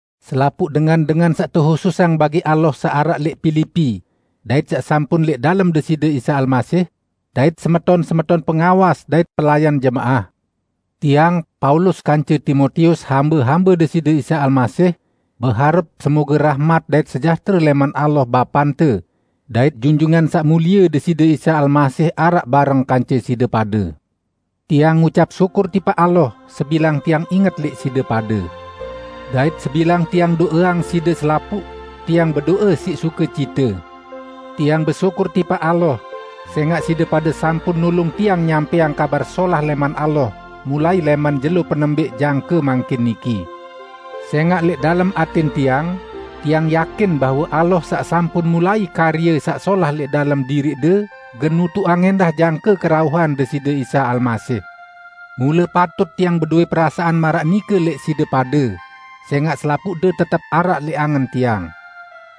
Selapuq dengan-dengan saq tehususang bagi Allah saq araq lẽq Pilipi, dait saq sampun lẽq dalem Deside Isa Almasih. Dait semeton-semeton pengawas dait pelayan jemaah! Tiang, Paulus, kance Timotius, hambe-hambe Deside Isa Almasih, beharep semoge rahmat dait sejahtere lẽman Allah, Bapante, dait Junjungan Saq Mulie Deside Isa Almasih araq bareng kance side pade. Tiang ngucap syukur tipaq Allah, sebilang tiang inget lẽq side pade. Dait sebilang tiang do'eang side selapuq, Tiang bedo'e siq sukecite. Tiang besyukur tipaq Allah sẽngaq side pade sampun nulung tiang nyampẽang Kabar Solah lẽman Allah mulai lẽman jelo penembẽq jangke mangkin niki. Sẽngaq lẽq dalem atẽn tiang, tiang yakin bahwe Allah, saq sampun mulai karye saq solah lẽq dalem diriqde gen nutuqang ẽndah jangke kerauhan Deside Isa Almasih. Mule patut tiang bedowẽ perasaan maraq nike lẽq side pade, sẽngaq selapuqde tetep araq lẽq angen tiang.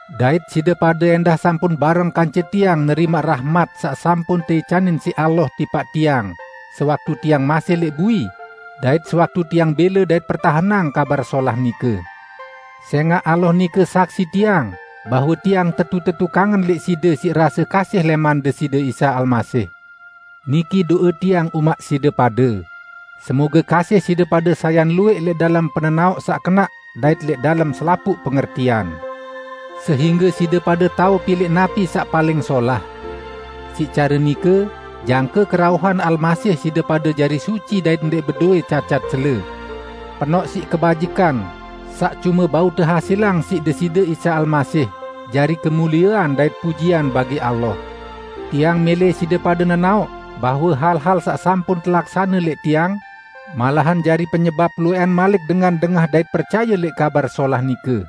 Dait side pade ẽndah sampun bareng kance tiang nerimaq rahmat saq sampun teicanin siq Allah tipaq tiang sewaktu tiang masih lẽq bui dait sewaktu tiang bẽle dait pertahenang Kabar Solah nike. Sẽngaq Allah nike saksi tiang bahwe tiang tetu-tetu kangen lẽq side siq rase kasih lẽman Deside Isa Almasih. Niki do'e tiang umaq side pade: Semoge kasih side pade sayan luwẽq lẽq dalem penenaoq saq kenaq dait lẽq dalem selapuq pengertian. Sehingge side pade tao pilẽq napi saq paling solah. Siq care nike, jangke kerauhan Almasih side pade jari suci dait ndẽq bedowẽ cacat cele, penoq siq kebajikan, saq cume bau tehasilang siq Deside Isa Almasih, jari kemuliean dait pujian bagi Allah. Tiang mẽlẽ side pade nenaoq bahwe hal-hal saq sampun telaksane lẽq tiang, malahan jari penyebap luwẽqan malik dengan dengah dait percaye lẽq Kabar Solah nike.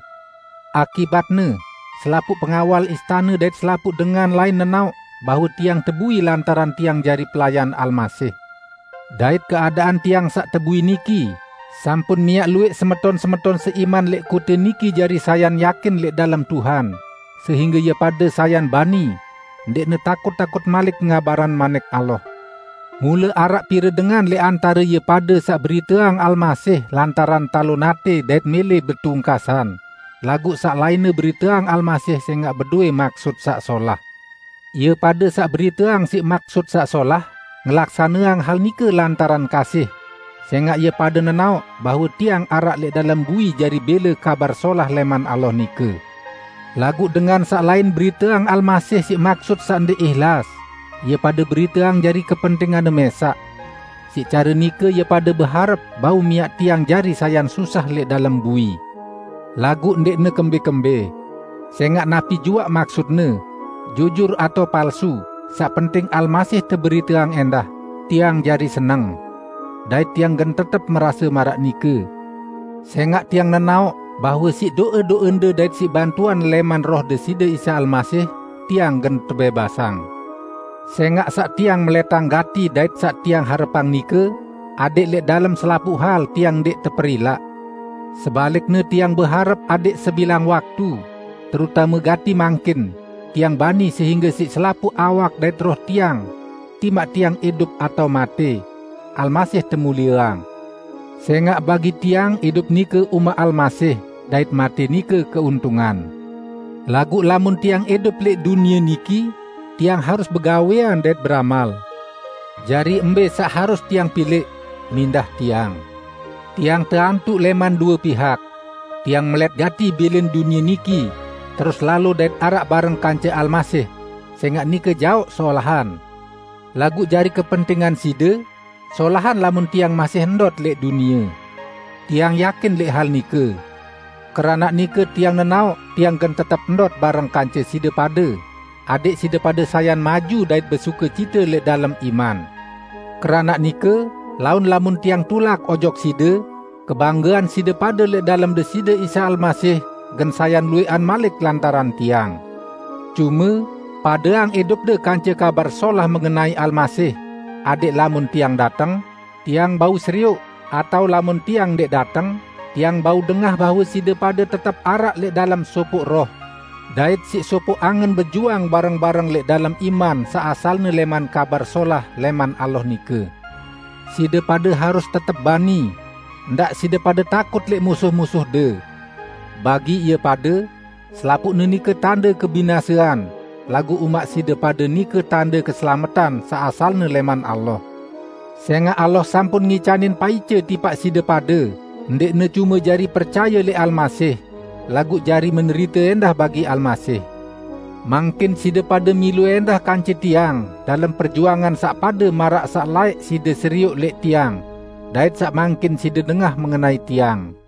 Akibatne, selapuq pengawal istane dait selapuq dengan lain nenaoq bahwe tiang tebui lantaran tiang jari pelayan Almasih. Dait keadaan tiang saq tebui niki sampun miaq luwẽq semeton-semeton seiman lẽq kote niki jari sayan yakin lẽq dalem Tuhan, sehingge ie pade sayan bani, ndẽqne takut-takut malik ngabarang Manik Allah. Mule araq pire dengan lẽq antare ie pade saq beriteang Almasih lantaran talon atẽ dait mẽlẽ betungkasan, laguq saq lainne beriteang Almasih sẽngaq bedowẽ maksut saq solah. Ie pade saq beriteang siq maksut saq solah ngelaksaneang hal nike lantaran kasih, sẽngaq ie pade nenaoq bahwe tiang araq lẽq dalem bui jari bẽle Kabar Solah lẽman Allah nike. Laguq dengan saq lain beriteang Almasih siq maksut saq ndẽq ihlas; ie pade beriteang jari kepentinganne mẽsaq. Siq care nike ie pade beharep bau miaq tiang jari sayan susah lẽq dalem bui. Laguq ndẽqne kembẽ-kembẽ! Sẽngaq napi juaq maksutne, jujur atao palsu, saq penting Almasih teberiteang ẽndah; tiang jari seneng. Dait tiang gen tetep merase maraq nike, sẽngaq tiang nenaoq bahwe siq do'e-do'ende dait siq bantuan lẽman Roh Deside Isa Almasih, tiang gen tebẽbasang. Sẽngaq saq tiang melẽtang gati dait saq tiang harepang nike, adẽq lẽq dalem selapuq hal tiang ndẽq teperilaq. Sebalikne tiang beharep adẽq sebilang waktu, terutame gati mangkin, tiang bani sehingge siq selapuq awak dait roh tiang -- timaq tiang idup atao matẽ -- Almasih temulieang. Sẽngaq bagi tiang idup nike umaq Almasih dait matẽ nike keuntungan. Laguq lamun tiang idup lẽq dunie niki, tiang harus begawẽan dait beramal. Jari mbẽ saq harus tiang pilẽq, mindah tiang. Tiang teantuq lẽman due pihak. Tiang melẽt gati bilin dunie niki, terus lalo dait araq bareng kance Almasih, sẽngaq nike jaoq solahan; laguq, jari kepentingan side, solahan lamun tiang masih ndot lẽq dunie. Tiang yakin lẽq hal nike. Keranaq nike tiang nenaoq tiang gen tetep ndot bareng kance side pade, adẽq side pade sayan maju dait besukecite lẽq dalem iman. Keranaq nike, laun lamun tiang tulak ojok side, kebanggean side pade lẽq dalem Deside Isa Almasih gen sayan luwẽqan malik lantaran tiang. Cume, padeang idupde kance Kabar Solah mengenai Almasih, adẽq lamun tiang dateng, tiang bau serioq, atao lamun tiang ndẽq dateng, tiang bau dengah bahwe side pade tetep araq lẽq dalem sopoq roh dait siq sopoq angen bejuang bareng-bareng lẽq dalem iman saq asalne lẽman Kabar Solah lẽman Allah nike. Side pade harus tetep bani: Ndaq side pade takut lẽq musuh-musuhde. Bagi ie pade, selapuqne nike tande kebinasean, laguq umaq side pade nike tande keselametan saq asalne lẽman Allah. Sẽngaq Allah sampun ngicanin paice tipaq side pade ndẽqne cume jari percaye lẽq Almasih, laguq jari menderite ẽndah bagi Almasih. Mangkin side pade milu ẽndah kance tiang dalem perjuangan saq pade maraq saq laẽq side serioq lẽq tiang, dait saq mangkin side dengah mengenai tiang.